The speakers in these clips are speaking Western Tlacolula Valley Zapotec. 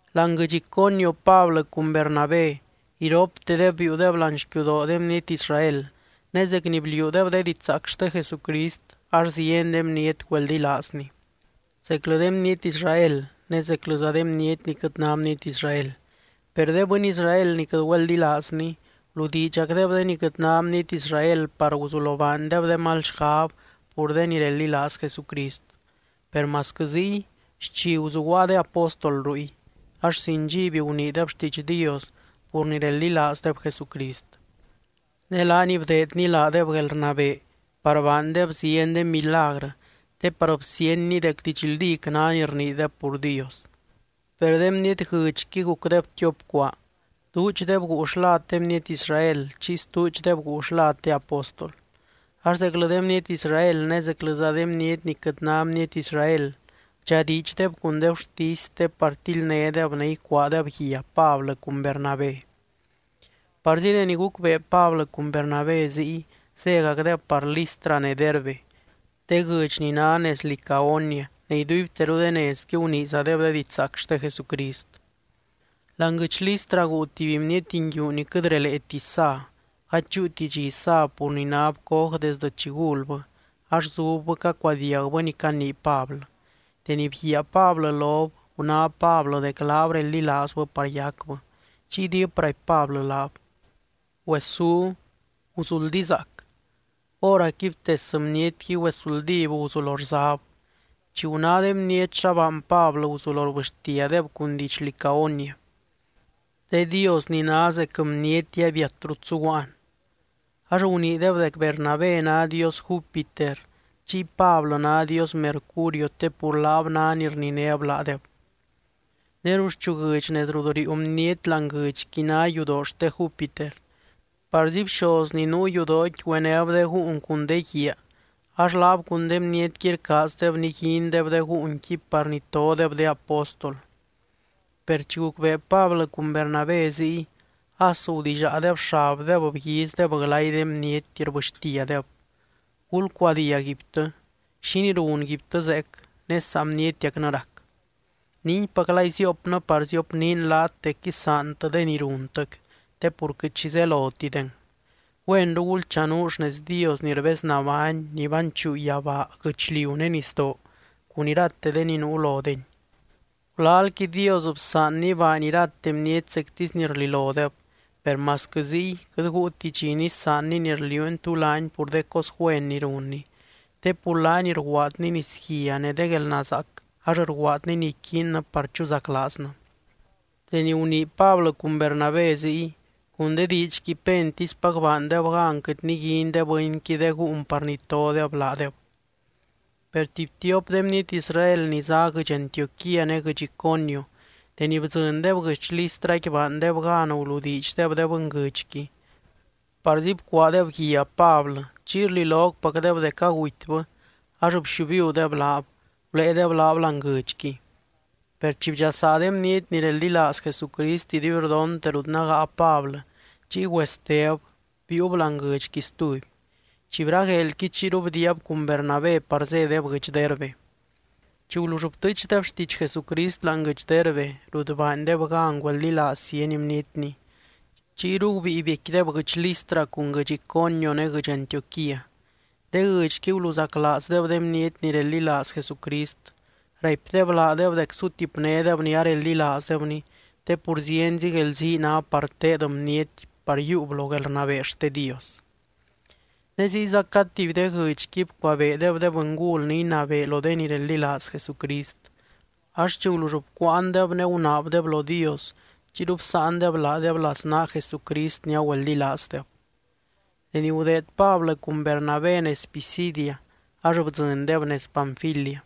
Láani guɨdx Iconio, Pablɨ cun Bernabé iroptedeb biiudeb láani xquiudoo de bniety Israel. Ne zec ni bliuudeb de didxzaac xte Jesucrist, ax zieny de bniety güeldilaazny, zeclɨ de bniety Israel ne zeclɨza de bniety ni quɨt ná bniety Israel. Per de bɨny Israel ni quɨt güeldilaazny guludiidxacdeb de ni quɨt ná bniety Israel par guzulo baandeb de mal xgab pur de ni reldilaaz Jesucrist. Per masquɨ ziy, xchi guzuguaa de apóstol ruy. Ax sin dxiby guniideb xtiidx Dios pur ni reldilaazdeb Jesucrist. Ne laany bdeedny laadeb guelrnabee par baandeb zieny de milagrɨ, te par bsíenny dec didxldíc ná ni rniideb pur Dios. Per de bniety guɨdxqui gucdeb tiop cuaa, duudxdeb guu xlad de bniety Israel, chiy stuudxdeb guu xlad de apóstol. Ax zeclɨ de bniety Israel ne zeclɨza de bniety ni quɨt ná bniety Israel bdxadiidxdeb cun de gurtisy te par tildnédeb ne icuaadeb guia Pablɨ cun Bernabé. Parzi deni gucbee Pablɨ cun Bernabé ziy, zégacdeb par Listra ne Derbe, de guɨdx ni ná nez Licaonia ne iduibteru de nezqui guniizadeb de didxzaac xte Jesucrist. Láani guɨdx Listra guu tuby bniety nguiu ni quɨt releeti sa, gady chúuti dxi sab pur ni náb coj desdɨ chi gulbɨ, ax zubbɨ cacuadiagbɨ ni canii Pablɨ. Deni bguiaa Pablɨ lob, guná Pablɨ dec laab reldilaazbɨ par yacbɨ. Chiy diip raipy Pablɨ laab: —Güesú. Guzuldizaac. Hóracqui btes bnietqui güesuldíb guzulo rzab. Chi guná de bniety xa baany Pablɨ, guzulo rbɨxtiadeb cun diidx Licaonia: —¡De dios ni ná zec bniety abiat rut zuguaan! Ax guniideb dec Bernabé ná dios Júpiter, chiy Pablɨ ná dios Mercurio te pur laab ná ni rninéb laadeb. Ne ruxchu guɨdx nez rut riiu bniety láani guɨdxqui ná yudoo xte Júpiter. Parzi bxoz ni nuu yudooqui güenéb de gúun cun de guiaa, ax laab cun de bnietqui rcaazdeb niguindeb de gúunqui par nitodeb de apóstol. Per chi gucbee Pablɨ cun Bernabé ziy, as gudillaadeb xabdeb, bguizdeb glay de bniety, rbɨxtiadeb: —¡Gulcuadiag guibtɨ! ¿Xínii runguibtɨ zeec, ne saa bnietiacnɨ rac? Ninguipaclay ziopnɨ par ziopniin laat dec isaantɨ de ni runtɨc, te pur quɨt xi zelotideng. Güenru gulchanuu xnez Dios ni rbeznabány ni banchuu yabaa, guɨchliu ne nisdoo cun irate de ni nuu lodeny. Gulalqui Dios bsaanny baany irate bniety zectisy ni rlilodeb. Per masquɨ ziy, quɨt guuti dxi nisaanny ni rliuuny tú laany pur de cos güen ni runny. Te pur laaniy rguaadny nisguia ne de guelnazaac ax rguaadny ni iquiinnɨ par chuzaclaaznɨ. Deni gunii Pablɨ cun Bernabé ziy, cun de diidxqui pentispac baandeb gan quɨt niguin de bɨnqui de gúun par nitodeb laadeb. Per tuby tiop de bniety Israel ni zá guɨdx Antioquía ne guɨdx Iconio, deni bdzɨndeb guɨdx Listraqui baandeb gan guludiidxdeb de bɨnguɨdxqui. Parzi bcuaadeb guia Pablɨ, chiy rlilocpacdeb dec agutybɨ ax bxiubiudeb laab, guléedeb laab láani guɨdxqui. Per chi bdxasaa de bniety ni reldilaaz Jesucrist iduibrdontec rut nágaa Pablɨ, chiy güesteb, biiub láani guɨdxqui stuby. Chi bragueelqui chiyru bdiiab cun Bernabé par zédeb guɨdx Derbe. Chi gulull btɨɨchdeb xtiidx Jesucrist láani guɨdx Derbe rut baandeb gan güeldilaaz zieny bnietny, chiyru gubíi biecquideb guɨdx Listra cun guɨdx Iconio ne guɨdx Antioquía. De guɨdxqui guluzaclaazdeb de bniety ni reldilaaz Jesucrist. Raipdeb laadeb dec sutipnédeb ni areldilaazdebny, te pur zienzi guelzii ná par teed bniety par yiiub lo guelrnabee xte Dios. Ne ziyza cad tuby de guɨdxqui bcuabeedeb de bɨngul ni inabee lo de ni reldilaaz Jesucrist. Ax chi gulull bcuuandeb ne gunaabdeb lo Dios, chiyru bsáandeb laadeb laznaa Jesucrist ni agüeldilaazdeb. Deni gudeed Pablɨ cun Bernabé nez Pisidia, ax bdzɨndeb nez Panfilia.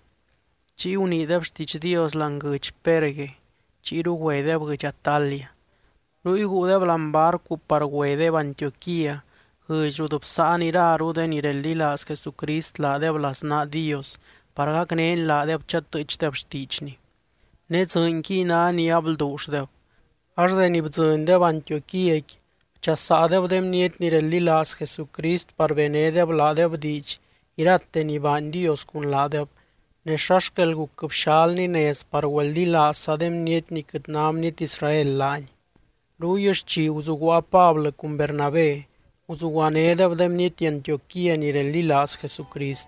Chiy guniideb xtiidx Dios láani guɨdx Perge. Chiyru güedeb guɨdx Atalia. Ruy guudeb láani barcu par güedeb Antioquía, guɨdx rut bsáan iraru de ni reldilaaz Jesucrist laadeb laznaa Dios par gacnény laadeb chatɨɨchdeb xtiidxny. Ne dzɨɨnquiy ná ni ablduulldeb. Ax deni bdzɨndeb Antioquíaqui, bchasaadeb de bniety ni reldilaaz Jesucrist par benédeb laadeb diidx irate ni baany Dios cun laadeb, ne xa xquel guc bxalny nez par güeldilaazza de bniety ni quɨt ná bniety Israel laany. Ruy xchi guzuguaa Pablɨ cun Bernabé, guzuguanédeb de bniety Antioquía ni reldilaaz Jesucrist.